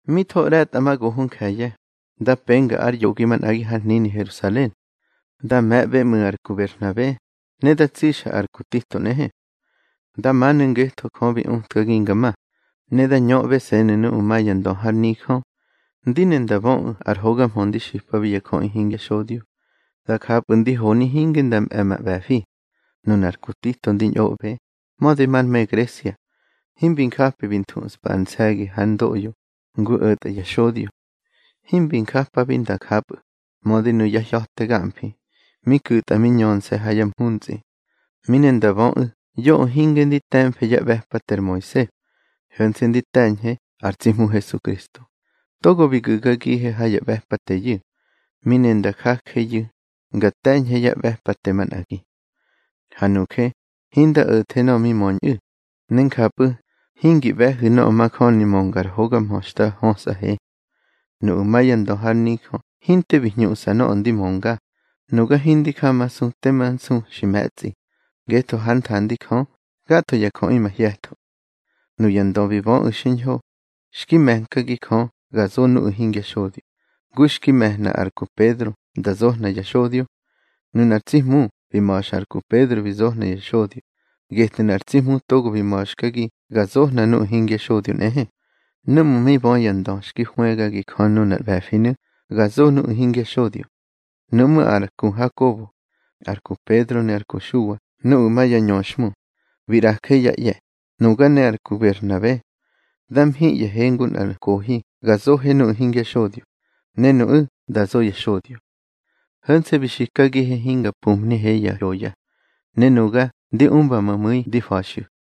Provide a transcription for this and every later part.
Mi tho ꞌre̱tꞌamagoho nje̱ye̱, da penga ár yoꞌgi manꞌagi har hnini Herusalen. Da me̱ꞌbe ꞌmu̱ ar ku Berhnabe, ne da tsixa ar ku Tito nꞌehe. Da manu̱ ngetho Jö bi utkagi nga ma. Ne da ñöꞌbese̱nu̱ nuꞌu̱ ma ya ndö har nijö, ndi ne nda böꞌu̱ ar hoga mhö di xipabi ya jöꞌi hingya xodyo. Da japꞌu̱ ndi honi hinge nda mꞌe̱ ma ꞌbe̱fi. Nunar ku Tito ndi ñꞌoꞌbe, mödi mar me Gresia, himbi njapi bi nthuspa ar nse̱gi hár ndoꞌyo ngu o̱tꞌa ya xodyo. Himbi njapi nda japꞌu̱, mödi nuya hya̱te gamfi mi ku̱tꞌa mi ꞌñöxte ha ya mhuntsꞌi. Mi ne nda böꞌu̱ yoꞌö hinge ndi te̱mfe yá ꞌbe̱pate ar Moise, ho̱nse̱ ndi te̱ñhe ar tsi Hmu Hesukristo, togo bi gu̱gagihe ha ya ꞌbe̱pateyu̱. Mi ne nda jajeyu̱ nga te̱ñhe ya ꞌbe̱pate manꞌagi. Ha nuje hinda o̱the nöꞌö mi möñꞌu̱, ne njapꞌu̱ hingi ꞌbe̱hu̱ nöꞌö majöni mönga ar hoga mhö xta hösꞌahe. Nuꞌu̱ ma ya ndö har nijö hinte bi hñuꞌsa nöꞌö ndi mönga. Nuga hindi jamasu tema nsu xi me̱tsꞌi, ngetho hár nthandi Jö gatho ya jöꞌi mahye̱tho. Nuya ndö bi böꞌu̱ xiñho, xki me̱nkagi Jö ga zo nuꞌu̱ hingya xodyo, ngu xki me̱hna ar ku Pedro nda zohna ya xodyo. Nunar tsi Hmu bi ma̱xa ar ku Pedro bi zohna ya xodyo, getnu̱ ar tsi Hmu togo xi ma̱xkagi ga zohna nuꞌu̱ hingya xodyo nꞌehe. Núꞌmu̱ mi bö ya ndö xki hwëgagi Jö nunar ꞌbe̱finu̱ ga zo nuꞌu̱ hingya xodyo, nuꞌmú̱ ar ku Hakobo, ar ku Pedro ne ar ku Xuwa nuꞌu̱ ma ya ñöxhmu, bi ꞌraje yá ꞌye̱, nuga ne ar ku Berhnabe. Da mhiꞌye̱he ngu nꞌar nkohi ga zoje nuꞌu̱ hingya xodyo, ne nuꞌu̱ da zo ya xodyo. Ho̱nse̱ bi xikagihe hinga pumhnihe ya hyoya, ne nuga ndi umba ma mu̱i ndi fa̱xꞌu̱.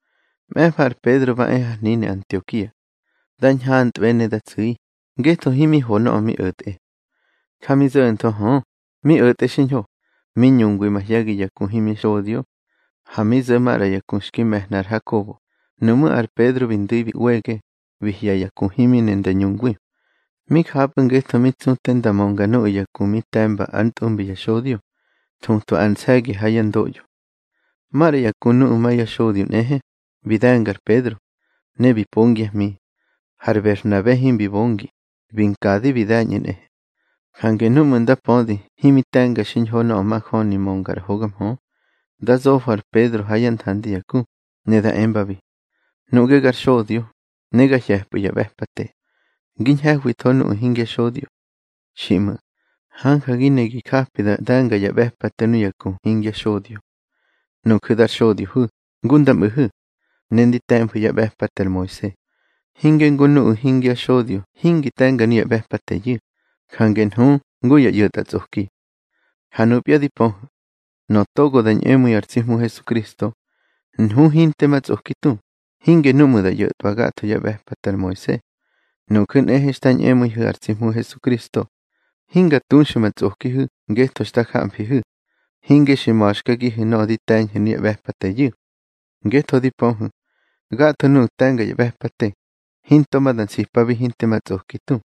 Mꞌe̱fa ar Pedro ba e har hnini Antiokia. Da ñhantꞌbe ne da tsu̱i, ngetho himi ho nöꞌö mi o̱tꞌe. Ja mi zo̱ntho hö, mi o̱tꞌe xiñho, mi ñungwi mahye̱gi ya ku himya xodyo. Ha mi zo̱ maꞌra ya ku xki me̱hna ar Hakobo, nuꞌmú̱ ar Pedro bi ndu̱i bi ꞌwege, bi hye̱ ya ku himi ne nda ñungwi. Mi japꞌu̱ ngetho mi tsu te nda mönga nuꞌu̱ ya ku mi te̱mba ár ntꞌumbi ya xodyo, thutwa ar nse̱gi ha yá ndoꞌyo. Maꞌra ya ku nuꞌu̱ ma ya xodyo nꞌehe, bi de̱nga ar Pedro, ne bi pongyá hmi. Har Berhnabe himbi bongi, bi nkadi bi de̱ñꞌu̱ nꞌehe. Jange núꞌmu̱ nda pödi himi te̱nga xiñho nöꞌö majöni mönga ar hoga mhö, da zofo ar Pedro ha yá nthandi ya ku, ne da embabi: Nuꞌge gar xodyo, ne ga hye̱pꞌu̱ ya ꞌbe̱pate, ngi ñhe̱hwitho nuꞌu̱ hingya xodyo. Xiꞌmu̱, hanja gi ne gi japi da de̱nga ya ꞌbe̱pate nuya ku hingya xodyo. Nuju̱ dar xodyohu̱ ngu nda mꞌu̱thu̱, ne ndi te̱mfu̱ yá ꞌbe̱pate ar Moise, hinge ngu nuꞌu̱ hingya xodyo hingi te̱nga nuya ꞌbe̱pateyu̱, jange nhu ngu ya ꞌyo̱tꞌatsꞌoki. Ha nupya di pöhu̱, nöꞌö togo da ñꞌemu̱i ar tsi Hmu Hesukristo, nhu hinte ma tsꞌoki tu, hinge núꞌmu̱ da ꞌyo̱twa gatho yá ꞌbe̱pate ar Moise. Nuju̱ nꞌehe xta ñꞌemu̱ihu̱ ar tsi Hmu Hesukristo, hinga tuxu̱ ma tsꞌokihu̱ ngetho xta jamfihu̱, hinge xi ma̱xkagihu̱ nöꞌö di te̱ñhu̱ nuya ꞌbe̱pateyu̱. Ngetho di pöhu̱, gatho nuꞌu̱ te̱nga ya ꞌbe̱pate, hinto ma da nsipabi hinte ma tsꞌoki tu.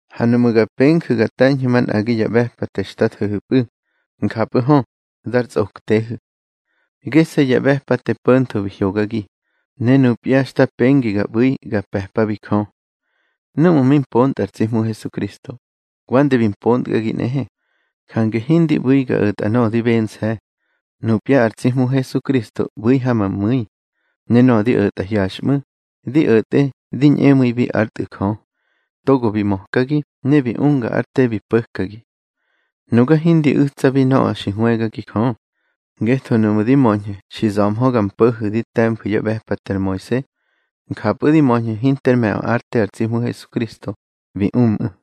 Ha nuꞌmu̱ ga penju̱ ga te̱ñhu̱ manꞌagi ya ꞌbe̱pate xta tho̱hu̱pꞌu̱, njapꞌu̱ hö, dar tsꞌoktehu̱. Gese̱ ya ꞌbe̱pate po̱ntho bi hyogagi, ne nupya xta pengi ga ꞌbu̱i ga pe̱pabi Jö. Núꞌmu̱ mi mpontꞌa ar tsi Hmu Hesukristo, wande bi mpontkꞌagi nꞌehe. Jange hindi ꞌbu̱i ga o̱tꞌa nöꞌö di bense̱. Nupya ar tsi Hmu Hesukristo ꞌbu̱ ha ma mu̱i. Ne nöꞌö di o̱tꞌa hyaxꞌmu̱, di o̱tꞌe di ñꞌemu̱ibi ár Tꞌu̱ Jö, togo bi mökagi ne bi unga ár te bi po̱kagi. Nuga hindi u̱tsabi nöꞌö xi hwëgagi Jö. Ngetho nuꞌmu̱ di möñhu̱ xi za̱mhö ga mpo̱hu̱ di te̱mfu̱ yá ꞌbe̱pate ar Moise, njapꞌu̱ di möñhu̱ hinter me̱ꞌö ár te ar tsi Hmu Hesukristo bi umꞌu̱.